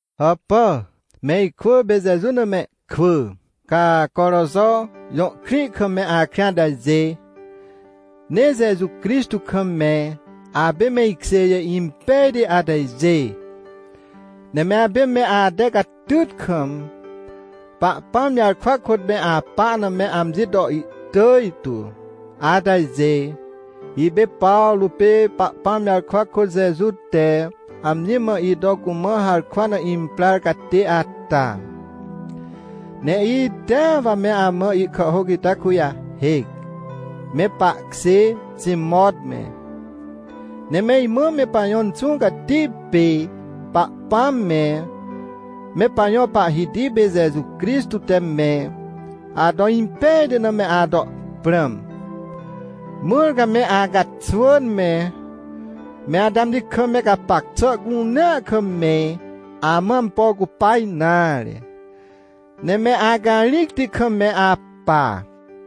Hàpà, me ikwỳ pê Jeju na mehkwỳ, ca Coroxo jõ krĩ kam me akrĩ atajê. Ne Jeju Crixtô kam me apê me ikjêjê impejti atajê. Ne me apê me ate catyt kam, Pahpãm jarkwa kôt me apa na me amji to ihtỳj tu atajê. Ipê Pawrô pê Pahpãm jarkwa kôt Jeju te amji mã ito cumã harkwa na imprar catê ata, ne itea wa me amã ihkàhhôc ita kujahêc, me pahkjê Timot me. Ne me imã me pajõ Inxũ Cati pê Pahpãm me, me pajõ Pahhiti pê Jeju Crixtô te me ato impejti na me ato prãm, mãr ca me acaxwỳn me, me ate amji kam me gapac xà cunea kam me amã ampo cupa nare, ne me acarĩcti kam me apa.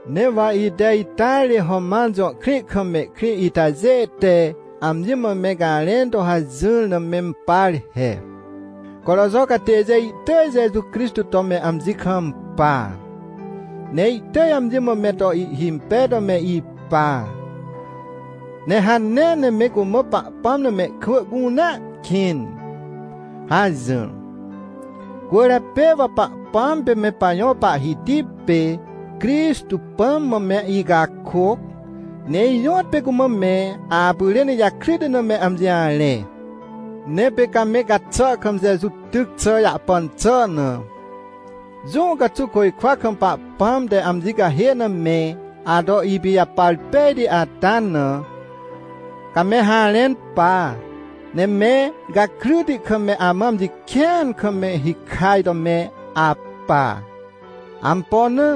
Ne wa ite ita ri Roman jõ krĩ kam mehkrĩ itajê te amji mã me garẽn to hajỹr na mempar he: — Coroxo catêjê ihtỳj Jeju Crixtô to me amji kampa, ne ihtỳj amji mã me to ihhimpej to me ipa, ne hanea ne me cumã Pahpãm na mehkwỳ cunea kĩn — hajỹr. Cwỳrjapê wa Pahpãm pê me pajõ Pahhiti pê Crixtô Pãm mã me icakôc, ne ijõtpê cumã me apyrên ijakryti na me amji jarẽ. Ne pê ca me gaxà kam Jeju tyc xà jahpan xà na, jũ caxuw côjkwa kam Pahpãm te amji cahê na me ato ipijapar pejti ata na, ca me harẽn pa, ne me gakryti kam me amã amji kĩan kam me hikaj to me apa. Ampo na?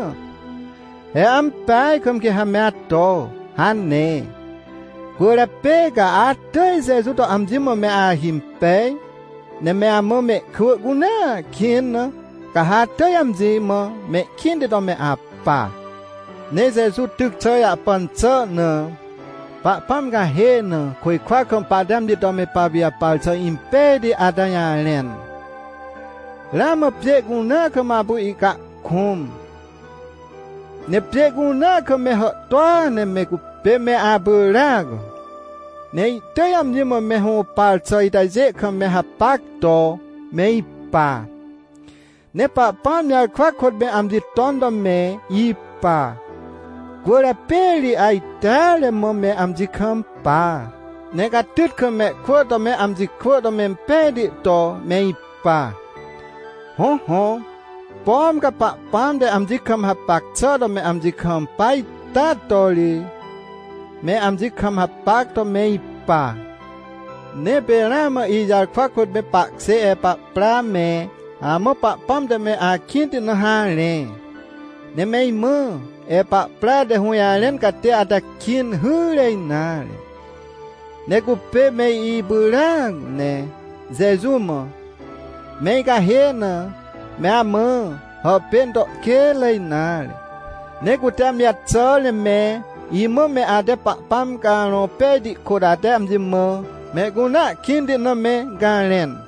He ampeaj kam quê ha me ato hane. Cwỳrjapê ca atỳj Jeju to amji mã me ahimpej ne me amã mehkwỳ cunea kĩn na, ca ha atỳj amji mã mehkĩnti to me apa. Ne Jeju tyc xà jahpan xà na, Pahpãm cahê na côjkwa kam pahte amji to me papijapar xà impejti ata jarẽn, ramã pjê cunea kam apu ihcahkũm. Ne pjê cunea kam me hàhtôa ne me cupê me apyràac, ne ihtỳj amji mã me hũpar xà itajê kam me hapac to me ipa. Ne Pahpãm jarkwa kôt me amji ton to me ipa. Cwỳrjapê ri ajteare mã me amji kampa, ne catyt kam mehkwỳ to me amji kwỳ to mempejti to me ipa. Hõhõ, pom ca Pahpãm te amji kam hapac xà to me amji kampa ita to ri, me amji kam hapac to me ipa. Ne pê ramã ijarkwa kôt me pahkjê Epapra me amã Pahpãm te me akĩnti na harẽ. Ne me imã Epapra te hũjarẽn catê ata kĩn hyre nare, ne cupê me ipyràac ne Jeju mã, me icahê na, me amã hàpên to kênre nare. Ne cute amji jaxàr ne me imã me ate Pahpãm Carõ Pejti kôt, ate amji mã mehcunea kĩnti na me garẽn.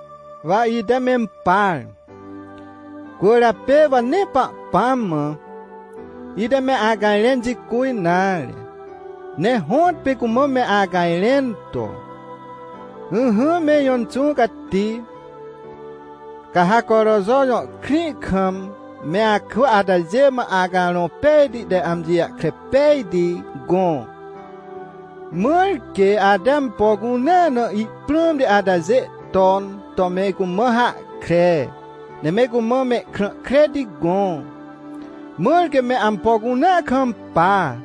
Wa ite mempar, cwỳrjapê wa nee Pahpãm mã, ite me acajrẽn jicu nare, ne hõtpê cumã me acajrẽn to: — Ỹhỹ me ijõ Inxũ Cati, ca ha Coroxo jõ krĩ kam me akwỳ atajê mã Acarõ Pejti te amji jahkre pejti gõ, mãr quê ate ampo cunea na ihprãmti atajê ton to me cumã hahkre. Ne me cumã mehkrã kreti gõ, mãr quê me ampo cunea kampa,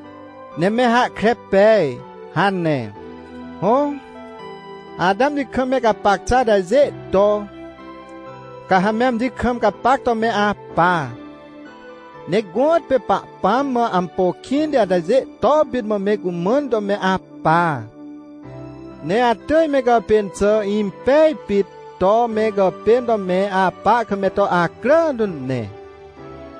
ne me hahkre pej — hane. Hõ, ate amji kam me gapac xà atajê to, ca ha me amji kam gapac to me apa, ne gõtpê Pahpãm mã ampo kĩnti atajê to pit mã me cumãn to me apa. Ne atỳj me gàpên xà impej pit to me gàpên to me apa kam me to acrà tu ne.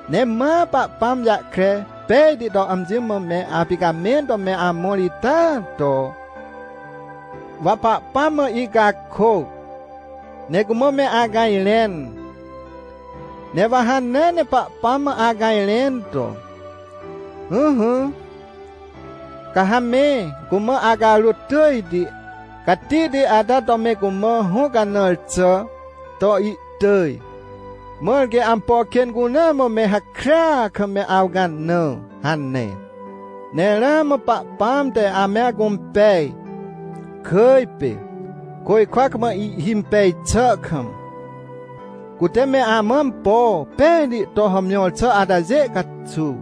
Ne ma Pahpãm jahkre pejti to amji mã me apicamẽn to me amõr ita to, wa Pahpãm mã icakôc, ne cumã me acajrẽn. Ne wa hanea ne Pahpãm mã acajrẽn to: — Ỹhỹ, ca ha me cumã acarôt tỳjti, catihti ata to me cumã hũcanãr xà to ihtỳj, mãr quê ampo kên cunea mã me hakrya kam me awcanã — hane. Ne ramã Pahpãm te ame acũmpej, kỳj pê côjkwa kam ihhimpej xà kam, cute me amã ampo pejti to hàmjõr xà atajê caxuw.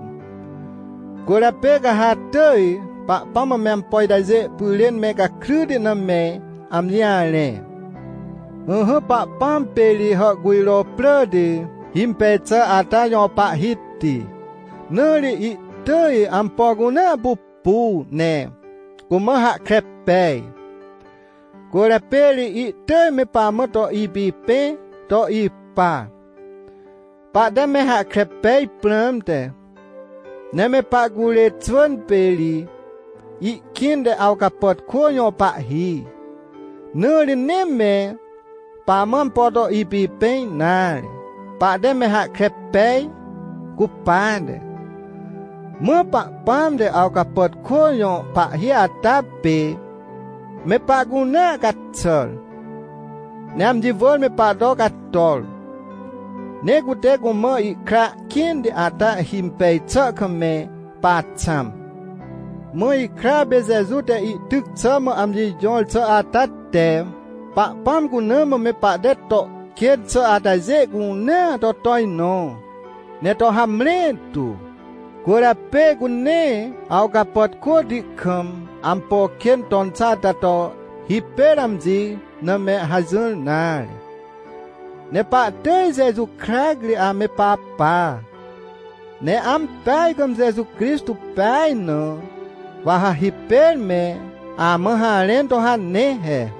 Cwỳrjapê ca ha atỳj Pahpãm mã me ampo itajê pyrên me gakryti na me amji jarẽ. Ỹhỹ, Pahpãm pê ri hàhcujro pràti himpej xà ata jõ Pahhiti, na ri ihtỳj ampo cunea pupu ne cumã hahkre pej. Cwỳrjapê ri ihtỳj me pamã to ipipẽ to ipa, pahte me hahkre pej prãmte. Ne me pahcurê xwỳn pê ri ihkĩnte awcapàtkô jõ pahhi, na ri nee me pamã ampo to ipipẽ nare, pahte me hahkre pej cupate. Mã Pahpãm te awcapàtkô jõ pahhi ata pê me pahcunea caxàr, ne amji wỳr me pahto cator, ne cute cumã ihkra kĩnti ata himpej xà kam me paxãm. Mã ihkra pê Jeju te ihtyc xà mã amji jõr xà ata te Pahpãm cuna mã me pahte to kên xà atajê cunea to tojnõ, ne to hamre tu. Cwỳrjapê cu nee awcapàtkôti kam ampo kên ton xà ata to hipêr amji na me hajỹr nare, ne pahtỳj Jeju krac ri ame papa. Ne ampeaj kam Jeju Crixtô pej na, wa ha hipêr me amã harẽn to hane he.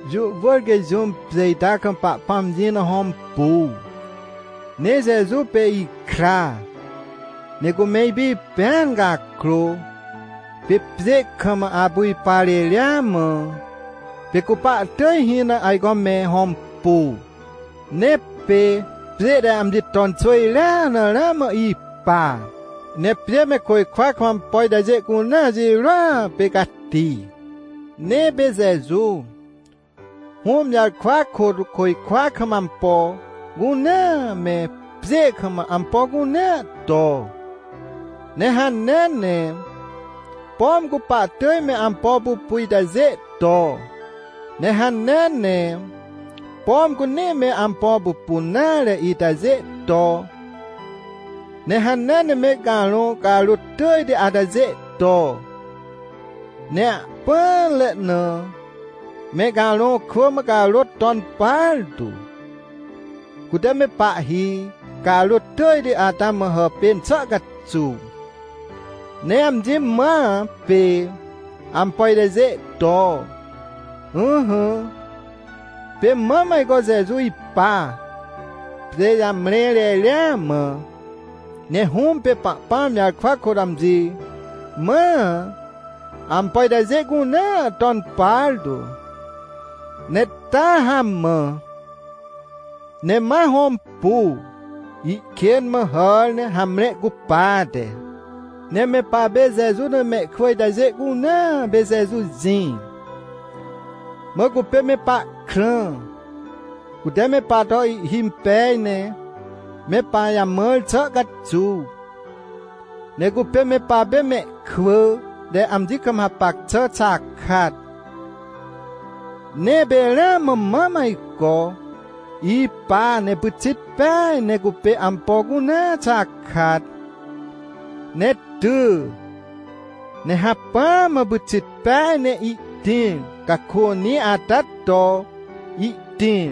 Jũ wỳr quê jũm pjê ita kam Pahpãm jĩ na hõmpu. Ne Jeju pê ihkra, ne cume ipipẽan cakrô, pê pjê kam apu ipa reria mã, pê cu pahtỳj hĩ na ajco me hõmpu. Ne pê pjê te amji ton xwỳjrea na ramã ipa. Ne pjê me côjkwa kam ampo itajê cunea jirôa pê cati. Ne pê Jeju, Hũm jarkwa kôt, côjkwa kam ampo cunea me, pjê kam ampo cunea to. Ne hanea ne, pom cu pahtỳj me ampo pupu itajê to, ne hanea ne, pom cu nee me ampo pupun nare itajê to. Ne hanea ne me carõ carôt tỳjti atajê to. Ne ahpỹanre na me carõ kwỳ mã carôt ton partu, cute me pahhi carôt tỳjti ata mã hàpên xà caxuw. Ne amji mãa pê ampo itajê to. Ỹhỹ, pê mam ajco Jeju ipa, pjê jamre reria mã. Ne Hũm pê Pahpãm jarkwa kôt amji mãa, ampo itajê cunea ton partu, ne taa hamã, ne ma hõmpu, ihkên mã hàr ne hamre cupate. Ne me papê Jeju na mehkwỳ itajê cunea pê Jeju jĩ, mã cupê me pahkrã, cute me pahto ihhimpej ne me pajamãr xà caxuw. Ne cupê me papê mehkwỳ te amji kam hapac xà xakat. Ne pê ramã mam ajco ipa, ne pyxit peaj ne cupê ampo cunea xakat. Ne ty, ne hacpỹa mã pyxit peaj ne ihtĩr cakônĩ ata to ihtĩr,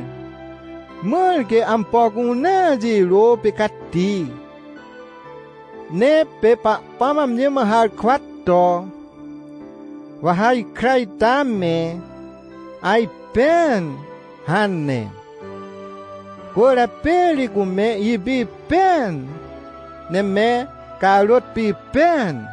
mãr quê ampo cunea jirô pê cati. Ne pê Pahpãm amji mã harkwa to: — Wa ha ikra ita me ajpẽan — hane. Cwỳrjapê ri cume ipipẽan, ne me carôt pipẽan.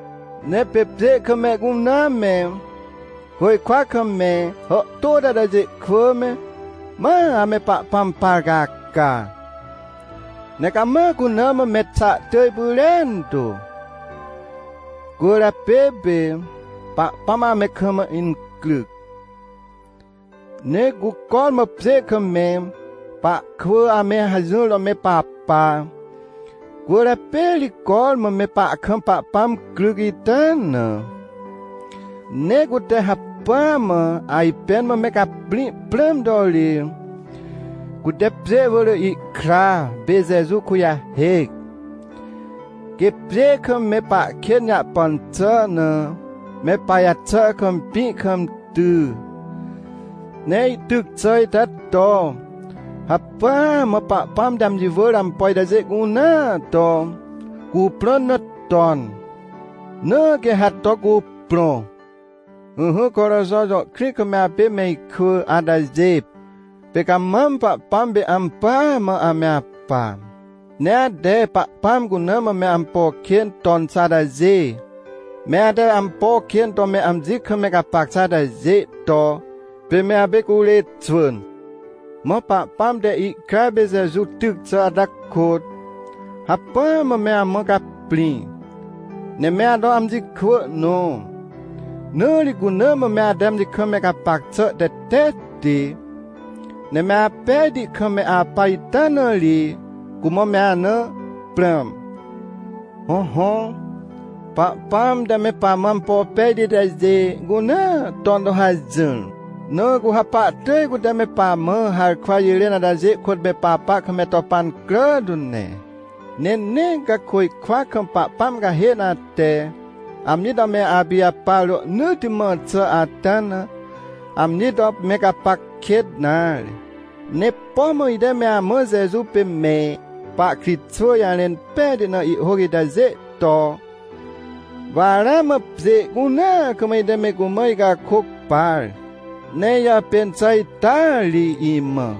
Ne pê pjê kam mehcunea me, côjkwa kam me hàhtôti atajê kwỳ me, ma ame Pahpãm par caca, ne cama cuna mã mexa tỳj pyrentu. Cwỳrjapê pê Pahpãm ame kam incryc. Ne cu cormã pjê kam me pahkwỳ ame hajỹr to me papa, cwỳrjapê ri cormã me pahkam Pahpãm cryc ita na. Ne cute hacpỹa mã ajpẽn mã me caprĩ prãm to ri, cute pjê wỳr ihkra pê Jeju kujahêc, quê pjê kam me pahkên jahpan xà na, me pajaxà kam, pĩ kam ty. Ne ihtyc xà ita to hacpỹa mã Pahpãm te amji wỳr ampo itajê cunea to cuprõn na ton, na quê ha to cuprõ. Ỹhỹ Coroxo jõ krĩ kam me apê me ikwỳ atajê, pê ca mam Pahpãm pê ampỳa mã ame apa, ne ate Pahpãm cuna mã me ampo kên ton xà atajê, me ate ampo kên to me amji kam me gapac xà atajê to pê me apê curê xwỳn. Mã Pahpãm te ihkra pê Jeju tyc xà ata kôt, hacpỹa mã me amã caprĩ, ne me ato amji kwỳ nõ. Na ri cuna mã me ate amji kam me gapac xà tetetti, ne me apejti kam me apa ita na ri, cumã me ana prãm. Hõhõ, Pahpãm te me pamã ampo pejti itajê cunea ton to hajỹr. Na cu ha pahtỳj cute me pamã harkwa jirên atajê kôt me papa kam me to pancrà tu ne. Ne nee ca côjkwa kam Pahpãm cahê na ate amji to me apijapar rohnỳtti mã xà ata na, amji to me gapac kêt nare. Ne pom ite me amã Jeju pê me pahkritxwỳ jarẽn pejti na ihhôc itajê to, wa ramã pjê cunea kam ite me cumã icakôc par. Ne ijàpên xà ita ri imã.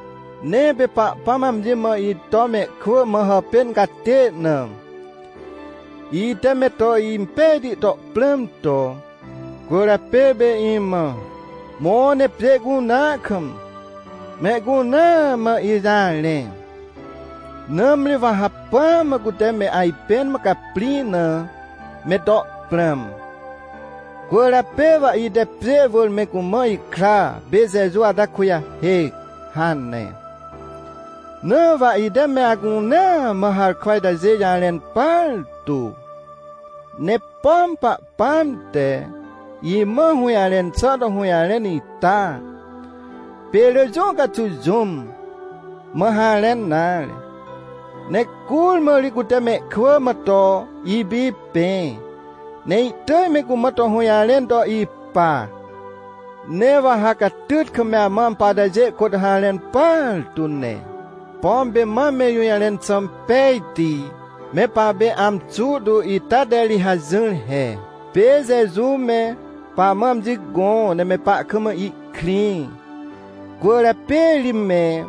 Ne pê Pahpãm amji mã ito mehkwỳ mã hàpên catê na, ite me to impejti to prãm to. Cwỳrjapê pê imã: — Mõ, ne pjê cunea kam, mehcunea mã ijarẽ, nãmri wa hacpỹa mã cute me ajpẽn mã caprĩ na me to prãm! Cwỳrjapê wa ite pjê wỳr me cumã ikra pê Jeju ata kujahêc — hane. Na wa ite me acunea mã harkwa itajê jarẽn partu. Ne pom Pahpãm te imã hũjarẽn xà to hũjarẽn ita, pê rỳ jũ caxuw jũm mã harẽn nare. Ne curmã ri cute mehkwỳ mã to ipipẽ, ne ihtỳj me cumã to hũjarẽn to ipa. Ne wa ha catyt kam me amã ampo atajê kôt harẽn partu ne. Pom pê mam me ijũjarẽn xà pejti me papê amxu tu ita te ri hajỹr he, pê Jeju me pamã amji gõ ne me pahkam ihkrĩ. Cwỳrjapê ri me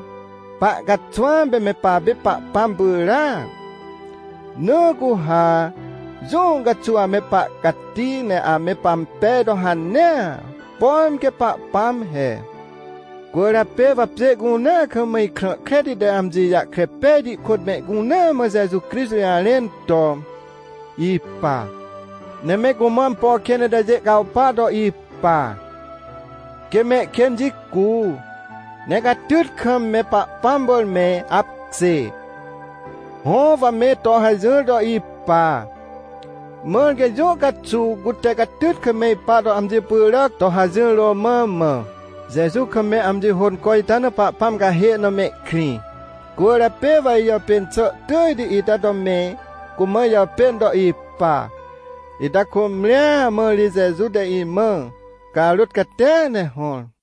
pahcaxwãm pê me papê Pahpãm pyràac. Na cu ha jũ caxuw ame pahcati ne ame pampej to hanea, pom quê Pahpãm he. Cwỳrjapê wa pjê cunea kam ikrã kreti te amji jahkre pejti kôt mehcunea mã Jeju Crixtô jarẽn to ipa. Ne me cumã ampo kên itajê cawpa to ipa, quê mehkên jicu, ne catyt kam me Pahpãm wỳr me apkjê. Hõ, wa me to hajỹr to ipa, mãr quê jũ caxuw cute catyt kam me ipa to amji pyràc to hajỹr romã mã, Jeju kam me amji hônco ita na Pahpãm cahê na mehkrĩ. Cwỳrjapê wa ijàpên xà tỳjti ita to me cumã ijàpên to ipa, ita cômrĩa mã ri Jeju te imã carôt catia ne hõr.